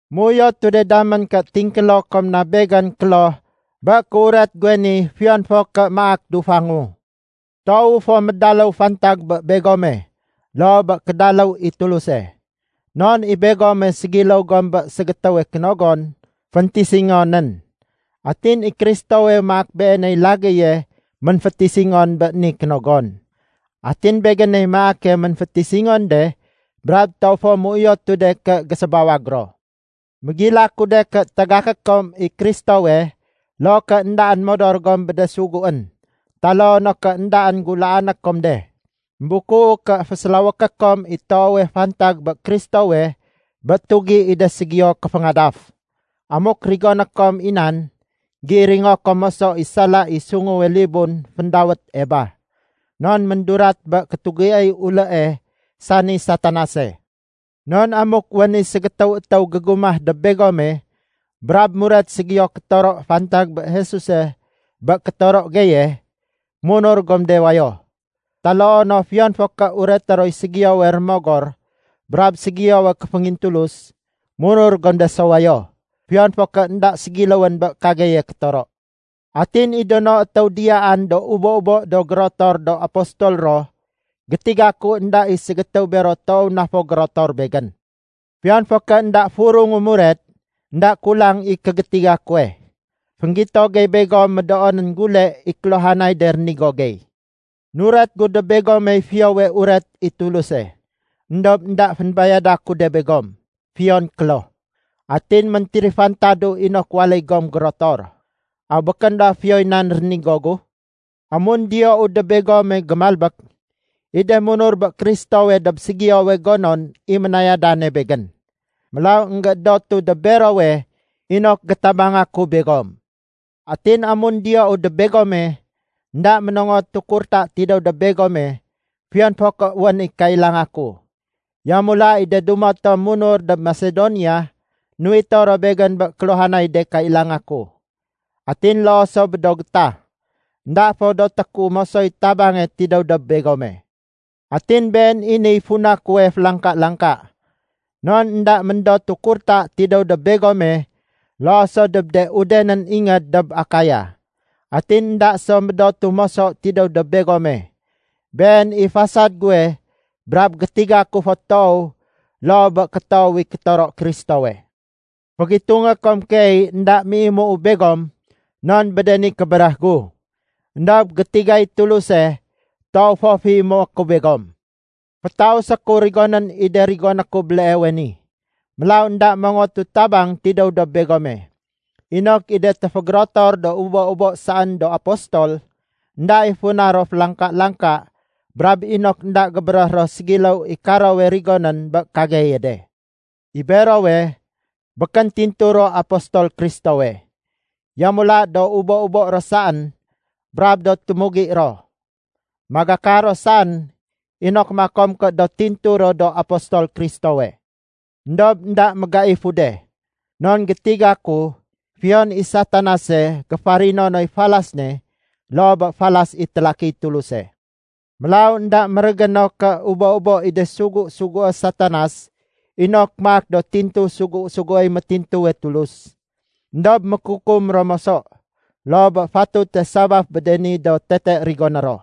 Méuyotu de damén ké tingkélo kom na begén kloh bé kéuret guwe ni fiyon fo ké maak dufangu. Toowu fo médaléw fantag bé begome loo bé kédaléw i Tuluse. Non i begome ségiléw gom bé ségétéwe kénogon féntisingonén. Atin i Kristowe maak beeney lagéye ménfétisingon bé ni kénogon. Atin begéney maake ménfétisingon de brab toow fo méuyotu de ké gésébawag ro. Mégilaku de ké tagaké kom i Kristowe loo ké éndaén modor gom bé de suguén taloo no ké éndaén gulaané kom de. Embukuu ké fésélawéké kom i toowe fantag bé Kristowe bé tugi i de ségiyo kéféngadaf. Amuk rigoné kom i nan, géiringo kom moso i sala i sunguwe libun féndawét Eba, non méndurat bé kétugiéy ulée, sani Satanase. Non amuk wén i ségétéw étéw gégumah dob begome, brab muret ségiyo kétoro fantag bé Jesuse bé kétoro geye, munur gom de wayo. Taloo no fiyon fo ké ureté roy ségiyowe rémogor brab ségiyowe kéféngintulus, munur gom de so wayo, fiyon fo ké énda ségiléwén bé kageye kétoro. Atin i do no étéw diyaan do ubo-ubo do gérotor do apostol ro, gétiga ku énda i ségétéw bero toow na fo gérotor begén. Fiyon fo ké énda furungu muret, énda kulang i kégétiga kuwe. Fénggito gey begom médoonén gule i kéluhanay de rénigo gey. Nuret gu dob begomey Fiyowe Uret i Tuluse, éndob énda fénbayada ku de begom, fiyon kloh. Atin méntérifantadu inok waléy gom gérotor. Aw békén ba fiyoy nan rénigo gu? Amun diyou dob begome gémalbék, i de munur bé Kristowe dob ségiyowe gonon i ménayadane begén. Mélaw énggéédotu dob berowe inok gétabanga ku begom. Atin amun diyou dob begome, énda ménongotu kurta tidéw dob begome fiyon fo ké wén i kailanga ku. Yamula i de dumo tom munur dob Masedonia, nuwito ro begén bé kéluhanay de kailanga ku. Atin loo so bé do gétah, énda fo doté ku mosoy tabange tidéw dob begome. Atin been i niy funa kuwe félangka-langka. Non énda méndotu kurta tidéw dob begome loo so dob de udenén ingéd dob Akaya. Atin énda so médotu moso tidéw dob begome. Been i fasad guwe brab gétiga ku fo toow loo bé kétoow i kétoro Kristowe. Fégitungé kom keey énda méimuu begom non bé de ni kébéréh gu. Endob gétigay Tuluse, toow fo féimué ku begom. Fétausé ku rigonén i de rigoné ku béleewe ni, mélaw énda mongotu tabang tidéw dob begome, inok i de téfégérotor do ubo-ubo saén do apostol, énda i funa ro félangka-langka brab inok énda gébéréh ro ségiléw i karowe rigonén bé kageye de. I berowe, békén tintu ro apostol Kristowe. Yamula do ubo-ubo ro saén, brab do témugi ro. Magakar ro saén inok makom ké do tintu ro do apostol Kristowe. Endob énda mégaifu de, non gétiga ku fiyon i Satanase géfarino noy falas ne loo bé falas i télakiy Tuluse. Mélaw énda mérégéno ké ubo-ubo i de sugu-sugué Satanas inok maak do tintu sugu-suguéy métintuwe Tulus. Endob mékukum ro moso loo bé fatute sabaf bé de ni do tete rigoné ro.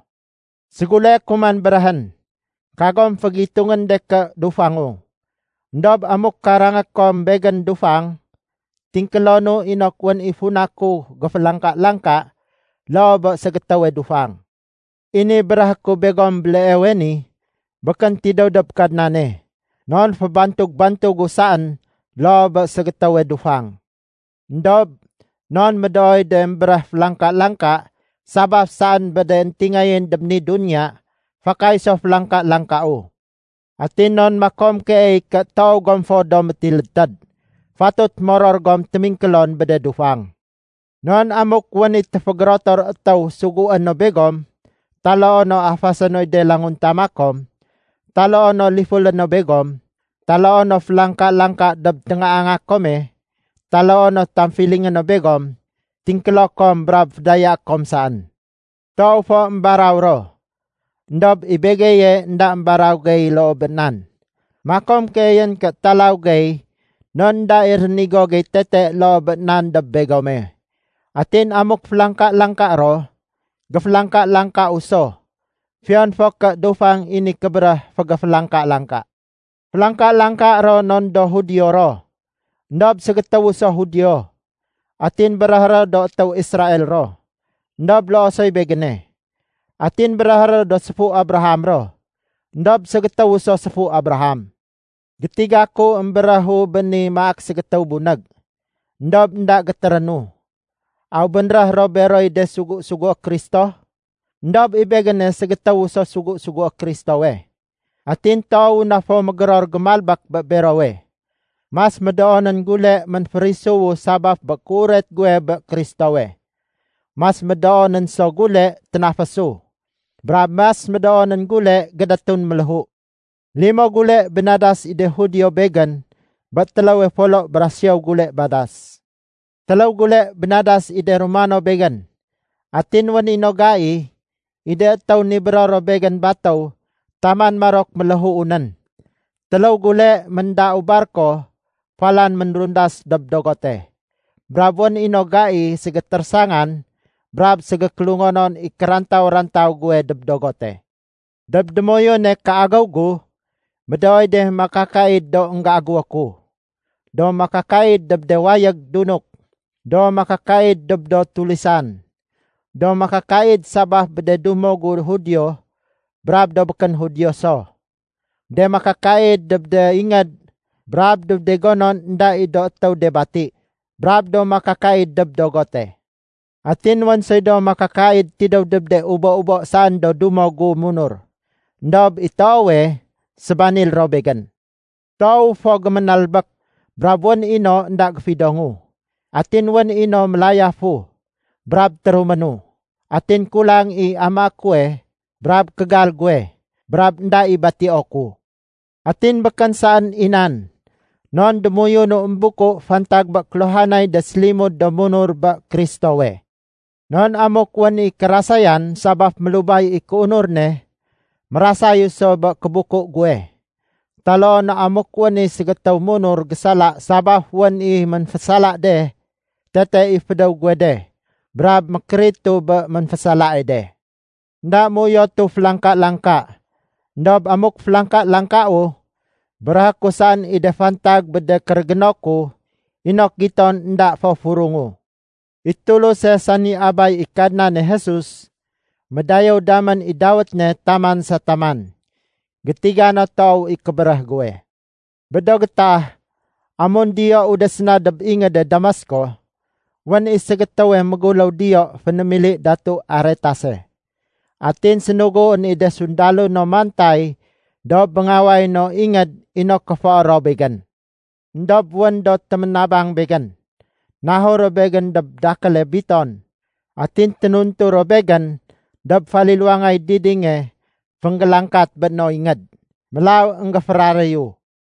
Séguleé ku man béréhén, kagom fégitungén de ké dufangu. Endob amuk karangé kom begén dufang, tingkélonu inok wén i funa ku géfélangka-langka loo bé ségétéwe dufang. I ni béréhé ku begom béleewe ni, békén tidéw dob Kadnane, non fébantug-bantugu saén loo bé ségétéwe dufang. Endob non médooy de émbéréh félangka-langka sabaf saén bé de éntingayén dob ni duniya, fakay so félangka-langkau. Atin non makom keey ké toow gom fo do métilédtéd, fatut moror gom témingkélon bé de dufang. Non amuk wén i téfégérotor étéw sugué no begom, taloo no afasé noy de languntama kom, taloo no lifulé no begom, taloo no félangka-langka dob téngaanga kome, taloo no tamfilingé no begom, tingkélo kom brab fédayaé kom saén. Toow fo émbaraw ro, éndob i begeye énda émbaraw gey loo bé nan. Makom keeyén ké talaw gey non énda i rénigo gey tete loo bé nan dob begome. Atin amuk félangka-langka ro, géfélangka-langkau so, fiyon fo ké dufang i ni kébéréh fégéfélangka-langka. Félangka-langka ro non do Judio ro. Endob ségétéwu so Judio. Atin béréhé ro do étéw Israel ro, éndob loo soy begéne. Atin béréhé ro do séfu Abraham ro, éndob ségétéwu so séfu Abraham. Gétiga ku émbéréhu béni maak ségétéw bunég, éndob énda gétérénu. Aw bénréh ro beroy de sugu-sugué Kristo? Endob i begéne ségétéw so sugu-sugué Kristowe, atin toowu na fo mégéror gémalbék bé berowe. Mas médoonén gule ménférisuwu sabaf bé kéuret guwe bé Kristowe. Mas médoonén so gule ténafésu, brab mas médoonén gule gédétun méléhu. Limo gule bénadas i de Judio begén bé téléwe folo bra siyow gule badas. Téléw gule bénadas i de Romano begén. Atin wén i no gai, i de étéw nibéro ro begén batéw taman marok méléhuu nén. Téléw gule méndau barko falan ménrundas dob dogote, brab wén i no gai ségétérésangan brab ségékélungonon i kérantaw-rantaw guwe dob dogote. Dob démoyune kéagéw gu, médooy de makakaid do énggéagéwo ku: do makakaid dob de wayég dunuk, do makakaid dob do tulisan, do makakaid sabaf bé de dumo gu Judio brab do békén Judio so, de makakaid dob de ingéd brab dob de gonon énda i do étéw de bati, brab do makakaid dob dogote. Atin wén soy do makakaid tidéw dob de ubo-ubo saén do dumo gu munur, éndob i toowe, sébanil ro begén. Toowu fo géménalbék, brab wén i no énda géfidongu. Atin wén i no mélayafu brab téruménu, atin kulang i amaé kuwe brab kégal guwe, brab énda i batio ku. Atin békén saén i nan, non démoyunu émbuku fantag bé kéluhanay de sélimud do munur bé Kristowe. Non amuk wén i kérasayan sabaf mélubay i kéunur ne, mérasayu so bé kébuku guwe. Taloo no amuk wén i ségétéw munur gésala sabaf wén i ménfésala de, tete i fédéw guwe de brab mékéritu bé ménfésalae de. Enda méuyotu félangka-langka, éndob amuk félangka-langkau, béréhé ku saén i de fantag bé de kérégéno ku inok giton énda fo furungu. I Tuluse sani Abay i Kadnane Jesus, médayéw damén i dawét ne taman sa taman. Gétiga no toow i kébéréh guwe. Bé do gétah amun diyou de séna dob ingéde Damasko, wén i ségétéwe méguléw diyo fénémili Datu Aretase. Atin sénuguén i de sundalo no mantay dob béngaway no ingéd inok kéfoé ro begén. Endob wén do téménabang begén, nahur ro begén dob dakéle biton. Atin ténuntu ro begén dob faliluwangay didinge fénggélangkat bé no ingéd. Mélaw énggéféraréyu.